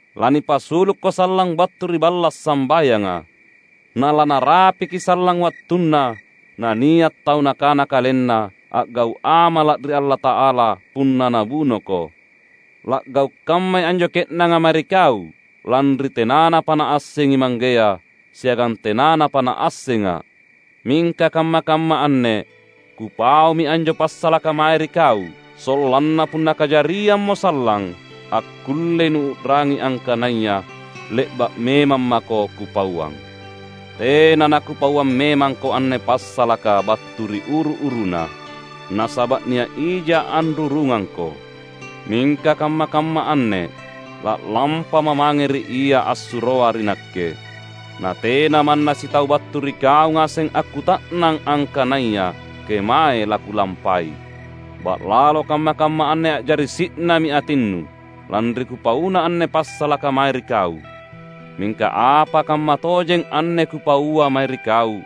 Lanipasulukko sallang battu ri balla’ sambayanga. Nalanarapiki sallang wattunna nania’ tau nakana kalenna a’gau’ amala’ ri Allata’ala punna nabunoko. La’gau’ kammai anjo ke’nanga mae ri kau, lanri tenanapa naassengi Manggea, siagang tenanapa naassengA’. Mingka kamma-kamma anne Kupaumi anjo passalaka mae ri kau, sollanna punna kajariammo sallang, akkullei nuu’rangi angkanaya le’ba’ memang mako Kupauang." "Tena naKupauang memangko anne passalaka battu ri uru-uruna, nasaba’ nia’ ijA’ anrurungangko. Mingka kamma-kamma anne la’lampaMa’ mange ri Ia assuroa ri Nakke; na tena manna sitau battu ri kau ngaseng akkuta’nang angkanaya kemae laKulampai. Ba’lalo kamma-kamma anne a’jari si’nami atinnu, lanri Kupauna anne passalaka mae ri kau. Mingka apa kammatojeng anne Kupaua mae ri kau: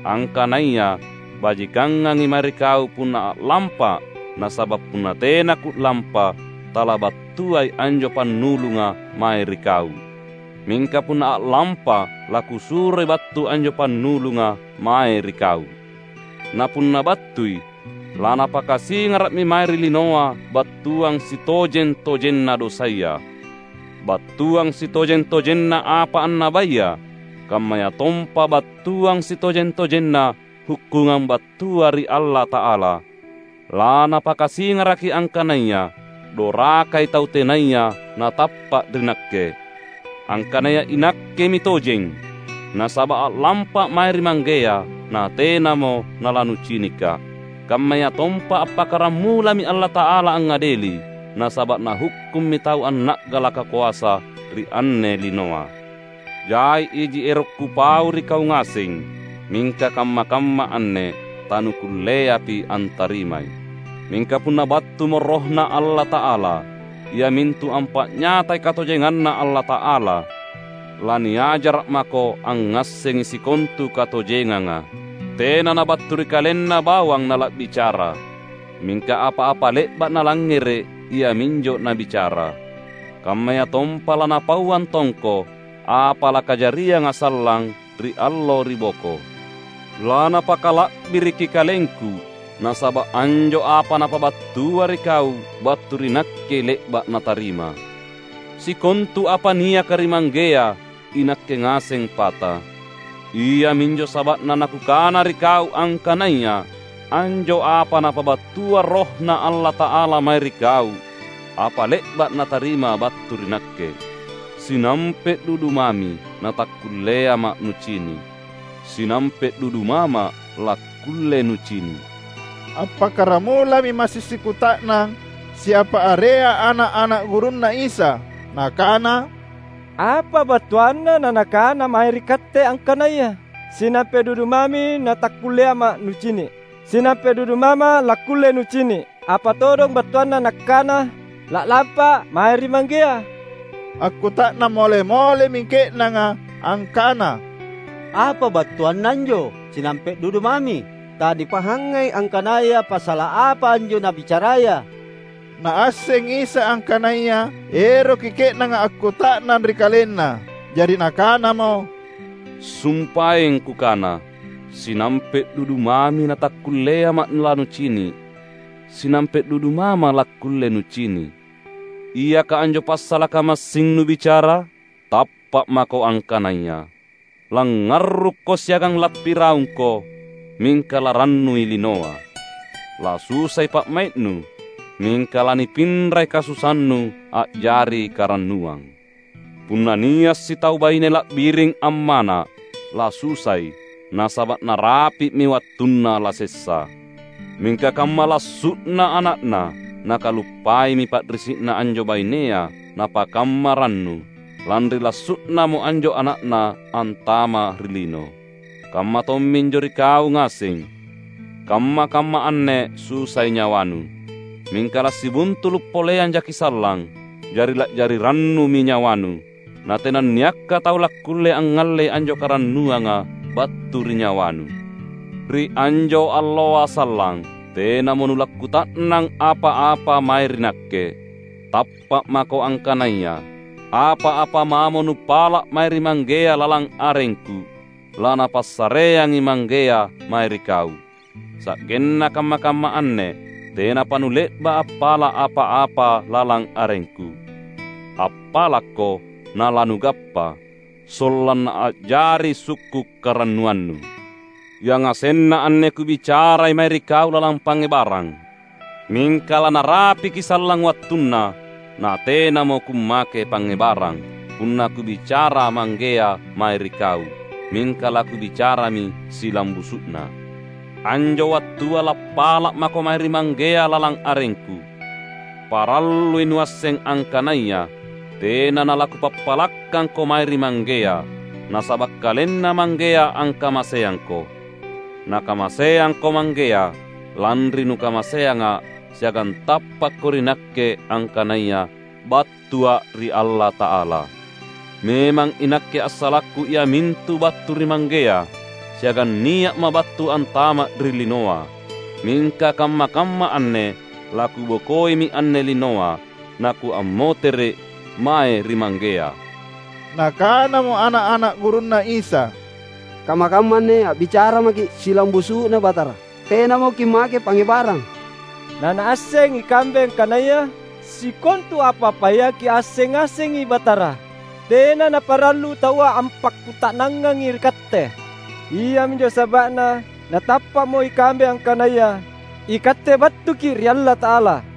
Angkanaya bajikangangi mae ri kau punna a’lampA’; nasaba’ punna tena Ku’lampa, talabattuai anjo Pannulunga mae ri kau. Mingka punna a’lampA’ laKusuroi battu anjo Pannulunga mae ri kau. Na punna battui, laNapakasingara’mi mae ri linoa battuang sitojeng-tojenna dosaya, battuang sitojeng-tojenna apa annabaya, kammayatompa battuang sitojeng-tojenna hukkungang battua ri Allata’ala. LaNapakasingaraki angkananaya dorakai tau tenaya natappa’ ri Nakke; angkanaya iNakkemi tojeng, nasaba’ a’lampA’ mae ri Manggea, natenamo nalanucinikKa’; kammayatompa appakkaramulami Allata’ala angngadeli, nasaba’ Nahukkummi tau anna’galaka koasa ri anne linoa. Jai iji ero’ Kupau ri kau ngaseng, mingka kamma-kamma anne tanukulleapi antarimai. Mingka punna battumo RohNa Allata’ala, iamintu ampa’nyatai katojenganNa Allata’ala, laniajara’ mako angngassengi sikontu katojenganga. Tena nabattu ri KalenNa bawang nala’bicara, mingka apa-apa le’ba’ Nalangngere’ iaminjo Nabicara. Kammayatompa laNapauang tongko apa lakajarianga sallang ri allo ri boko. LaNapakala’biriki KalengKu, nasaba’ anjo apa Napabattua ri kau, battu ri Nakkei le’ba’ Natarima. Sikontu apa niaka ri Manggea iNakke ngaseng pata. Iaminjo saba’na naKukana ri kau angkanaya anjo apa Napabattua RohNa Allata’ala mae ri kau, apa le’ba’ Natarima battu ri Nakke." "Sinampe’ dudu mami natakkulleaMa’ nucini’; sinampe’ dudu maMa’ lakkulle nucini’." Appakkaramulami massing sikuta’nang siapa area ana’-ana’ gurunNa Isa, nakana, "Apa battuanna naNakana mae ri katte angkanaya: ‘Sinampe’ dudu mami natakkulleaMa’ nucini’; sinampe’ dudu maMa’ lakkulle nucini"? Apa todong battuanna nangkana, ‘La’lampA’ mae ri Manggea’?" Akkuta’nang mole-molemi ke’nanga angkana, "Apa battuanna anjo, ’sinampe’ dudu mami’? Tanipahangai angkanaya passala’ apa anjo Nabicaraya!" Naassengi Isa angkanaya eroki ke’nanga akkuta’nang ri KalenNa. Jari Nakanamo, "Sumpaeng Kukana, ‘Sinampe’ dudu mami natakkulleaMa’ lanucini’; sinampe’ dudu maMa’ lakkulle nucini’.’ Iaka anjo passalaka massing nubicara? Tappa’ mako angkanaya, langngarrukko siagang lappiraungko, mingka larannui linoa. Lasusai pa’mai’nu, mingka lanipinrai kasusannu a’jari karannuang. Punna nia’ sitau baine la’biring ammana’, lasusai, nasaba’ narapi’mi wattunna lasessa. Mingka kamma lassu’na ana’na, nakaluppaimi pa’risi’na anjo bainea napakamma rannu, lanri lassu’namo anjo ana’na antama’ ri lino. Kamma tomminjo ri kau ngaseng: kamma-kamma anne susai nyawanu, mingka lasibuntulu’ poleang jaki’ sallang, jari la’jari rannumi nyawanu. Na tenanniakka tau lakkulle angngallei anjo karannuanga battu ri nyawanu. Ri anjo alloa sallang, tenamo nulakkuta’nang apa-apa mae ri Nakke. Tappa’ mako angkanaya: apa-apa mamo nupala’ mae ri Manggea lalang arengKu, laNapassareangi Manggea mae ri kau. Sa’genna kamma-kamma anne tenapa nule’ba’ appala’ apa-apa lalang arengKu. Appalakko, nalanugappa, sollanna a’jari sukku’ karannuannu." "Yangasenna anne Kubicarai mae ri kau lalang pangngebarang. Mingka lanarapiki sallang wattunna, natenamo Kummake pangngebarang, punna Kubicara Manggea mae ri kau, mingka laKubicarami silambusu’na. Anjo wattua lappala’ mako mae ri Manggea lalang arengKu. Parallui nuasseng angkanaya tena nalaKupappalakkangko mae ri Manggea, nasaba’ KalenNa Manggea angkamaseangko. Nakamaseangko Manggea, lanri nukamaseangA’, siagang tappakko ri Nakke angkanaya battuA’ ri Allata’ala. Memang iNakke assalakKu iamintu battu ri Manggea, siagang nia’Ma’ battu antama’ ri linoa. Mingka kamma-kamma anne laKubokoimi anne linoa, naKuammotere’ mae ri Manggea." Nakanamo ana’-ana’ gurunNa Isa, "Kamma-kamma anne a’bicara maKi’ silambusu’na Batara; tenamo Kimmake pangngebarang, nanaasseng ikambe angkanaya sikontu apa-apaya Kiasseng ngasengi, Batara. Tena naparallu taua ampakkuta’nangangi ri Katte. Iaminjo saba’na natappa’mo ikambe angkanaya iKatte battuKi’ ri Allata’ala."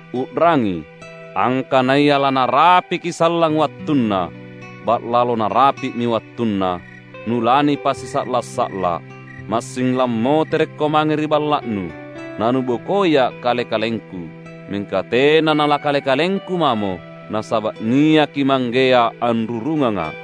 U’rangi! Angkanaya lanarapiki sallang wattunna, ba’lalo narapi’mi wattunna, nulanipasisa’la’-sa’la’. Massing lammoterekko mange ri balla’nu, nanubokoiA’ Kale-kalengKu. Mingka tena nalaKale-kalengKu mamo, nasaba’ niaki Manggea anrurungangA’.